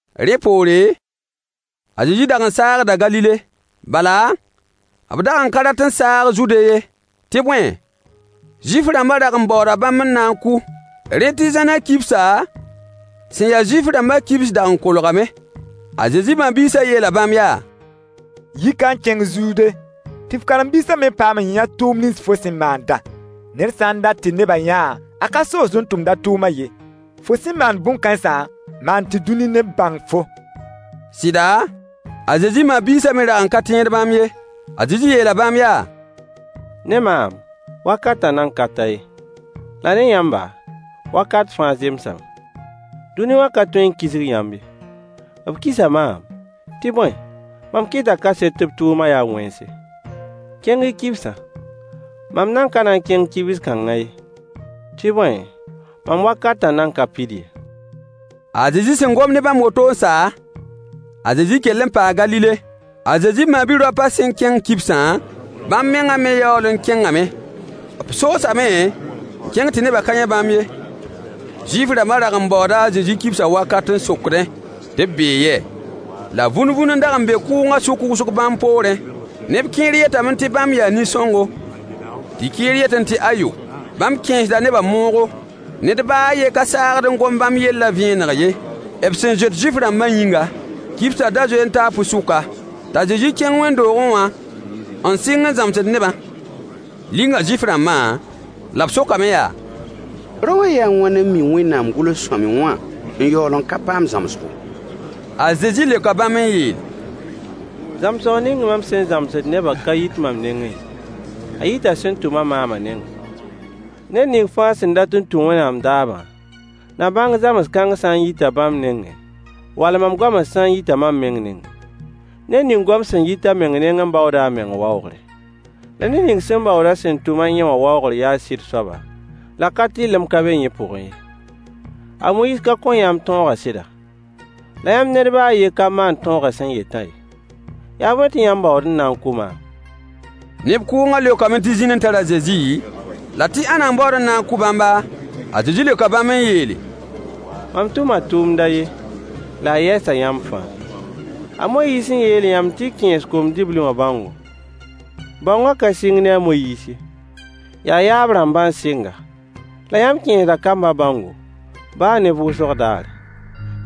Rẽ poore, a Zezi dag n saagda Galile, bala, b dag n ka rat n saag Zude ye. Tɩ bõe, Zuif-rãmbã dag n baooda bãmb n na n kʋ. Rẽ tɩ zãnã kibsa, sẽn ya Zuif-rãmbã kibs dag n kolgame. A Zezi ma-biisã yeela bãmb yaa: Yi ka n kẽng Zude tɩ f karen-biisã me paam n yã tʋʋm nins fo sẽn maandã. Ned sã n dat tɩ nebã yã-a, a ka soosd n tʋmd a tʋʋmã ye. Fo sẽn maand bõn-kãensã, maan tɩ dũni neb bãng-fo. Sɩda, a Zezi ma-biisã me dag n ka tẽed bãmb ye. A Zezi yeela bãmb yaa: Ne maam, wakatã nan ka ta ye, la ne yãmba, wakat fãa zemsame. Dũni wã ka tõe n kisg yãmb ye. B kisa maam, tɩ bõe, mam kɩta kaset tɩ b tʋʋmã yaa wẽnse. Kẽng-y kibsã. Mam nan ka na n kẽng kibs kãngã ye, tɩ bõe, mam wakatã nan ka pid ye. A Zezi sẽn gom ne bãmb woto n sa, a Zezi kell n paa Galile. A Zezi ma-bi-raopã sẽn kẽng kibsã, bãmb mengã me yaool n kẽngame. B soosame n kẽng tɩ nebã ka yã bãmb ye. Zuif-rãmbã dag n baooda a Zezi kibsã wakat n sokdẽ tɩ b bee yɛ? La vũn-vũn n dag n be kʋʋngã sʋk wʋsg bãmb poorẽ. Neb kẽer yetame tɩ bãmb yaa nin-sõngo, tɩ kẽer yetẽ tɩ ayo, bãmb kẽesda nebã moogo. Ned baa a yen ka saagd n gom bãmb yellã vẽeneg ye, b sẽn zoet Zuif-rãmbã yĩnga. Kibsã da zoe n taa pʋɩ-sʋka, t'a Zezi kẽng wẽnd-doogẽ wã, n sɩng n zãmsd nebã. Linga Zuif-rãmbã, la b sokame yaa: Rao wã yɩɩ wãn n mi Wẽnnaam gʋls-sõamy wã n yaool n ka paam zãmsgo? A Zezi leoka bãmb n yeele: Zãmsg ning mam sẽn zãmsd nebã ka yit mam nengẽ ye, a yita sẽn tʋm-a maamã nengẽ. Ned ning fãa sẽn dat n tũ Wẽnnaam daabã na bãng zãms-kãng sã n yita bãmb nengẽ, wall mam goamã sã n yita mam meng nengẽ. Ned ning goam sẽn yit a meng nengẽ baooda a meng waoogre. La ned ning sẽn baood sẽn tʋm-a yẽ wã waoogr yaa sɩd soaba, la ka-tɩrlem ka be yẽ pʋgẽ ye. A Moyiis ka kõ yãmb tõogã sɩda? La yãmb ned baa a yen ka maand tõogã sẽn yetã ye. Yaa bõe tɩ yãmb baood n na n kʋ maam? Neb kʋʋngã leokame tɩ zĩn n tar a Zezi, la tɩ ãnna n baood n na n kʋ bãmba? A Zezi leoka bãmb n yeele: Mam tʋma tʋʋmd a yen, la a yɛɛsa yãmb fãa. A Moyiis n yeel yãmb tɩ y kẽes kom-dibli wã bãongo — bãongã ka sɩng ne a Moyiis ye, yaa yaab-rãmbã n sɩng-a, — la yãmb kẽesda kambã bãongo, baa ne vʋʋsg daare.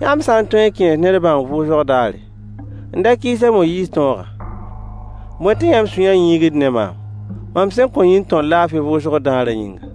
Yãmb sã n tõe n kẽes ned bãong vʋʋsg daare, n da kɩɩs a Moyiis tõogã, bõe tɩ yãmb sũyã yĩigd ne maam, mam sẽn kõ yĩn-tõr laafɩ vʋʋsg daarã yĩnga?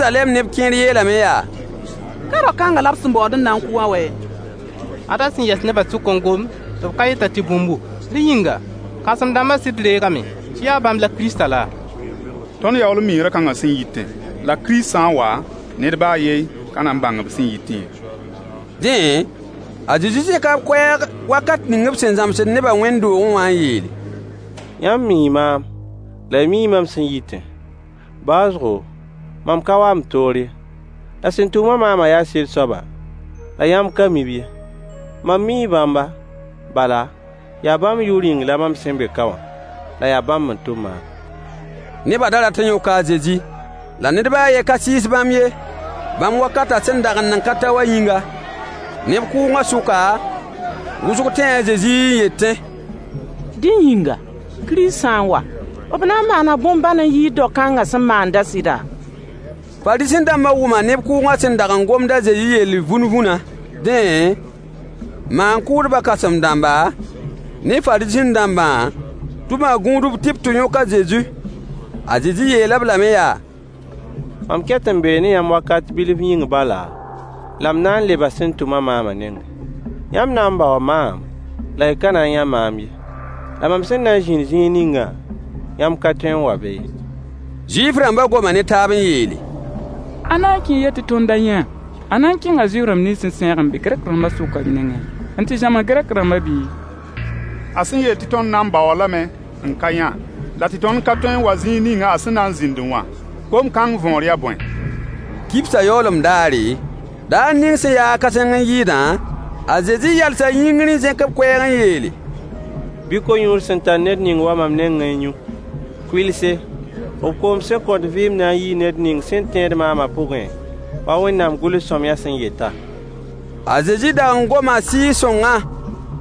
Zeruzalɛm neb kẽer yeelame yaa: Ka rao kãngã la b sẽn baood n na n kʋ wã wɛ? Ad a sẽn yɛs nebã sʋk n gomd tɩ b ka yet-a tɩ bũmbu! Rẽ yĩnga, kãsem-dãmbã sɩd reegame tɩ yaa bãmb la Kiristã laa? Tõnd yaool n mii rao kãngã sẽn yitẽ. La Kirist sã n wa, ned baa a yen ka na n bãng b sẽn yitẽ ye. Dẽ, a Zezi zẽka b koɛɛg wakat ning b sẽn zãmsd nebã wẽnd-doogẽ wã n yeele: Yãmb mii maam, la y mii mam sẽn yitẽ. Baoosgo, mam ka wa m toor ye. La sẽn tʋm-a maamã yaa sɩd soaba, la yãmb ka mi-b ye. Mam mii bãmba, bala, yaa bãmb yʋʋr yĩng la mam sẽn be ka wã, la yaa bãmb n tʋm maam. Nebã da rat n yõka a Zezi, la ned baa a yen ka sɩɩs bãmb ye, bãmb wakatã sẽn dag n nan ka ta wã yĩnga. Neb kʋʋngã sʋka, wʋsg tẽe a Zezi n yetẽ: Dẽ yĩnga, Kirist sã n wa, b na n maana bõn-bãn n yɩɩd dao kãngã sẽn maandã sɩda? Fariisẽ-dãmbã wʋma neb kʋʋngã sẽn dag n gomd a Zezi yell vũn-vũnã. Dẽ, maan-kʋʋdbã kãsem-dãmba ne Fariisẽ-dãmbã tʋma gũudb tɩ b tɩ yõk a Zezi. A Zezi yeel-b lame yaa: Mam ket n bee ne yãmb wakat bilf yĩng bala, la m na n leba sẽn tʋm-a maamã nengẽ. Yãmb na n baoo maam, la y ka na n yã maam ye, la mam sẽn na n zĩnd zĩig ningã, yãmb ka tõe n wa be ye. Zuif-rãmbã goma ne taab n yeele: A na n kẽe yɛ tɩ tõnd da yã-a? A na n kẽnga Zuif-rãmb nins sẽn sãeeg n be Gɛrk-rãmbã sʋka nengẽ n tɩ zãms Gɛrk-rãmbã bi? A sẽn yeel tɩ tõnd na n baoo-a lame n ka yã, la tɩ tõnd ka tõe n wa zĩig ning a sẽn na n zĩndẽ wã, gom kãng võor yaa bõe? Kibsã yaoolem daare, daar ning sẽn ya-a kãseng n yɩɩdã, a Zezi yalsa yĩngr n zẽk b koɛɛg n yeele: Bɩ Ko-yũud sẽn tar ned ning wa mam nengẽ n yũ. Kʋɩlse, b koom sẽn kõt vɩɩm na n yii ned ning sẽn tẽed maamã pʋgẽ, wa Wẽnnaam gʋls-sõamyã sẽn yetã. A Zezi dag n goma Sɩɩg-sõngã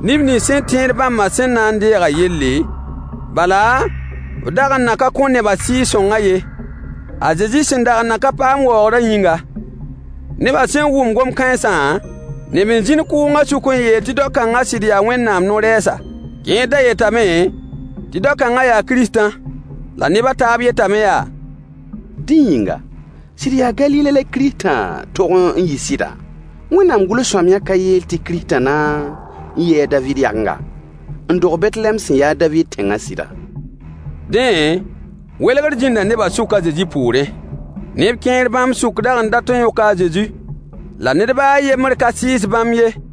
neb nins sẽn tẽed bãmbã sẽn na n deegã yelle. Bala, b dag n nan ka kõ nebã Sɩɩg-sõngã ye, a Zezi sẽn dag n nan ka paam waoogrã yĩnga. Nebã sẽn wʋm gom kãensã, neb n zĩnd kʋʋngã sʋk n yeel tɩ dao kãngã sɩd yaa Wẽnnaam no-rɛɛsa. Kẽer da yetame tɩ dao-kãngã yaa Kiristã. La neb a taab yetame yaa: Dẽ yĩnga, sɩd yaa Galile la Kiristã tog n yi sɩda? Wẽnnaam gʋls-sõamyã ka yeel tɩ “Kiristã na n yɩɩ a Daviid yagenga, n dog Betlehɛm sẽn yaa a Daviid tẽngã” sɩda? Dẽ, welgr zĩnda nebã sʋk a Zezi poorẽ. Neb kẽer bãmb sʋk dag n dat n yõka a Zezi, la ned baa a yembr ka sɩɩs bãmb ye.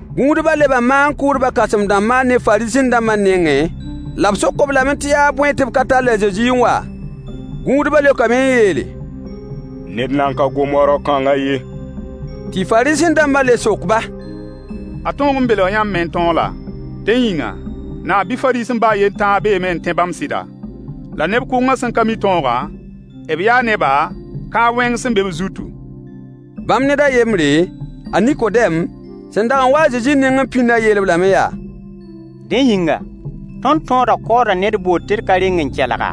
Gũudbã leba maan-kʋʋdbã kãsem-dãmbã ne Fariisẽ-dãmbã nengẽ, la b sok-b lame tɩ yaa bõe tɩ b ka tall a Zezi n wa? Gũudbã leokame n yeele: Ned nan ka gom wa rao-kãngã ye. Tɩ Fariisẽ-dãmbã le sok-ba: A tõog n belga yãmb me n tõog laa? Dẽ yĩnga, naab bɩ Fariisẽ baa a yen tãa beeme n tẽ bãmb sɩda? La neb kʋʋngã sẽn ka mi tõogã, b yaa neba, kãab-wẽng sẽn be b zutu. Bãmb ned a yembre, a Nikodɛm, sẽn dag n wa-a a Zezi nengẽ pĩndã yeel-b lame yaa: Dẽ yĩnga, tõnd tõodã kaooda ned bʋʋd tɩ d ka reng n kelg-a,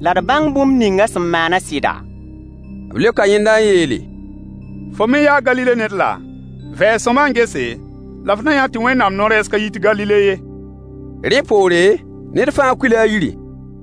la d bãng bũmb ning a sẽn maanã sɩda? B leoka yẽnda n yeele: Fo me yaa Galile ned laa? Vɛɛs sõama n gese, la f na yã tɩ Wẽnnaam no-rɛɛs ka yit Galile ye. [ Rẽ poore, ned fãa kuila a yiri.